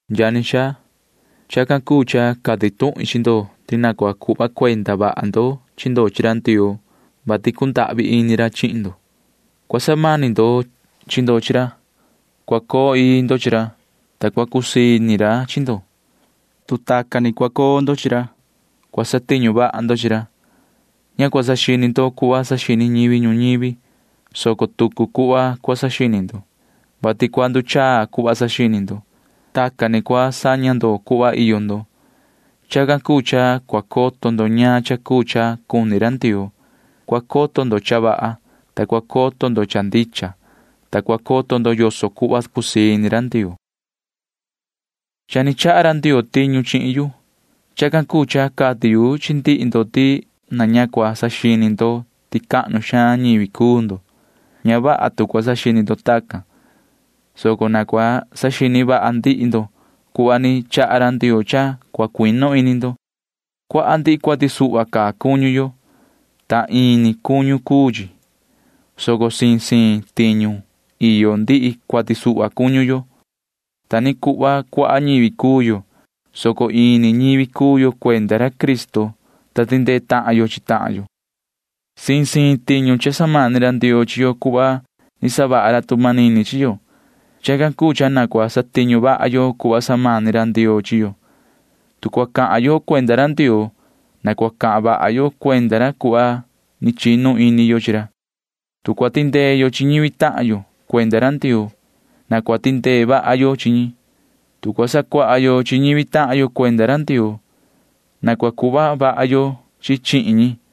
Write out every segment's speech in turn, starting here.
Yani xaa, chacan cuu cha cati tuhin chi ndo ti na cua cuhva cuenda ndo chi ndo chi ra Ndioo, vati cundahvi ini ra chihin ndo. Cua samani ndo chi ndo chi ra. Cua coo ii ndo chi ra, ta cua cusii ini ra chi ndo. Tu tacan ni cua coo ndo chi ra, cua satiñu vaha ndo chi ra. Ña cua saxini ndo cuhva saxini ñivi ñuñivi, soco tucu cuhva cua saxini ndo, vati cua nduchaa cuhva saxini ndo. Tacan ni cua saña ndo cuhva iyo ndo. Chacan cuu cha cua coto ndo ñaan cha cuu cha cuni ra Ndioo. Cua coto ndo cha vaha, ta cua coto ndo cha ndicha, ta cua coto ndo yoso cuhva cusii ini ra Ndioo. Cha ni chaha ra Ndioo tiñu chihin yu. Chacan cuu cha cati yu chi ndihi ndo ti na ña cua saxini ndo ti cahnu xaan ñivi cuu ndo. Ña vaha tu cua saxini ndo tacan, soco na cua saxini vaha ndihi ndo cuhva ni chaha ra Ndioo cha cua cuinu ini ndo. Cuaha ndihi cuati suhva caa cuñu yo, ta ini cuñu yo cuu chi, soco siin siin tiñu iyo ndihi cuati suhva cuñu yo. Ta ni cuhva cuaha ñivi cuu yo, soco ini ñivi cuu yo cuenda ra Cristo, ta tindee tahan yo chi tahan yo. Siin siin tiñu cha samani ra Ndioo chi yo cuhva ni savaha ra tu manini chi yo. Chacan cuu cha na cua satiñu vaha yo cuhva ni samani ra Ndioo chi yo. Tu cua cahan yo cuenda ra Ndioo, na cua cahan vaha yo cuenda ra cuhva ni chinu ini yo chi ra. Tu cua tindee yo chi ñivi tahan yo cuenda ra Ndioo, na cua tindee vaha yo chi ñi. Tu cua sacuaha yo chi ñivi tahan yo cuenda ra Ndioo, na cua sacuaha vaha ndicha yo chi ñi.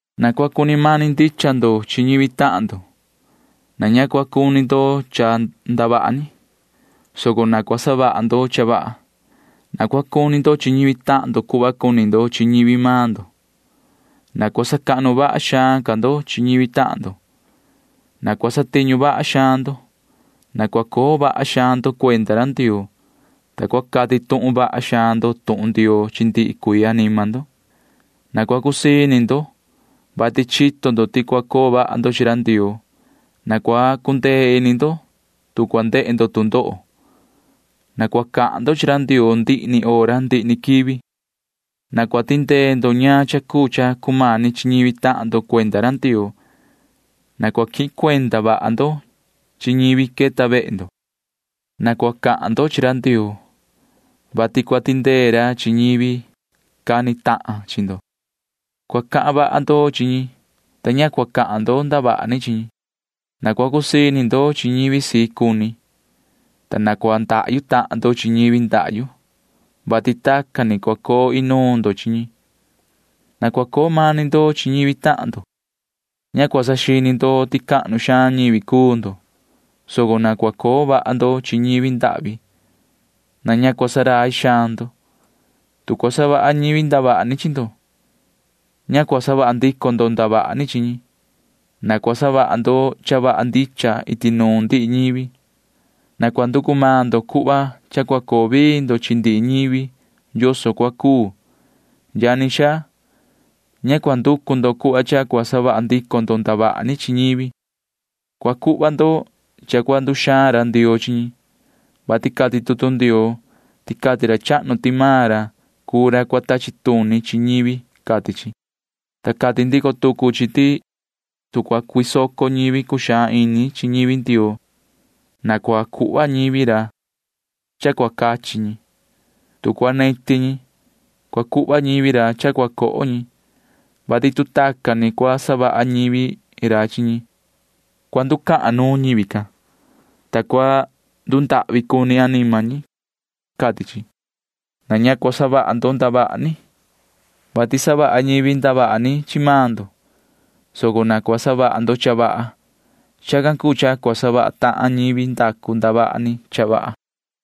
Na cua cuni mani ndicha ndo chi ñivi tahan ndo. Na ña cua cuni ndo cha ndavaha ni, soco na cua savaha ndo cha vaha. Na cua cuni ndo chi ñivi tahan ndo cuhva cuni ndo chi ñivi maan ndo. Na cua sacahnu vaha xaan ca ndo chi ñivi tahan ndo. Na cua satiñu vaha xaan ndo. Na cua coo vaha xaan ndo cuenda ra Ndioo, ta cua cati tuhun vaha xaan ndo tuhun Ndioo chi ndihi cuii anima ndo. Na cua cusii ini ndo, vati chito ndo ti cua coo vaha ndo chi ra Ndioo. Na cua cundee ini ndo, tu cua ndehe ndo tu ndoho. Na cua cahan ndo chi ra Ndioo ndihi ni hora ndihi ni quivi. Na cua tindee ndo ñaan cha cuu cha cumani chi ñivi Ndioo tahan ndo. Na cua quihin cuenda vaha ndo chi ñivi queta vehe ndo. Na cua cahan ndo chi ra Ndioo, vati cua tindee ra chi ñivi cani tahan chi ndo. Cua cahan vaha ndo chi ñi, ta ña cua cahan ndo ndavaha ni chi ñi. Na cua cusii ini ndo chi ñivi sii cuni, ta na cua ndahyu tahan ndo chi ñivi ndahyu, [vati tacan ni cua coo inuun ndo chi ñi]. Na cua coo mani ndo chi ñivi tahan ndo. Ña cua saxini ndo ti cahnu xaan ñivi cuu ndo, soco na cua coo vaha ndo chi ñivi ndahvi. Na ña cua ndurai ndo. Tu cua savaha ñivi ndavaha ni chi ndo, ña cua savaha ndico ndo ndavaha ni chi ñi. Na cua savaha ndo cha vaha ndicha iti nuun ndihi ñivi. Na cua nducu maan ndo cuhva cha cua coo vii ndo chi ndihi ñivi yoso cua cuu. Yani xaa, ña cua nducu ndo cuhva cha cua savaha ndico ndo ndavaha ni chi ñivi, soco cua cuhva ndo cha cua nduxaan ra Ndioo chi ñi, vati cati tutu Ndioo ti cati ra chahnu ti maan ra cuu ra cua tachi tuni chi ñivi, cati chi, ta cati ndico tucu chi ti tu cua cuisoco ñivi cuxaan ini chi ñivi Ndioo, na cua cuhva ñivi ra cha cua cachi ñi. Tu cua neti ñi, cua cuhva ñivi ra cha cua coho ñi, vati tu tacan ni cua savaha ñivi ra chi ñi, cua nducahan xaan nuun ñivi can, ta cua ndundahvi cuni anima ñi, cati chi. Na ña cua savaha ndo ndavaha ni, vati savaha ñivi ndavaha ni chi maan ndo, soco na cua savaha ndo cha vaha. Chacan cuu cha cua savaha tahan ñivi ndacu ndavaha ni cha vaha.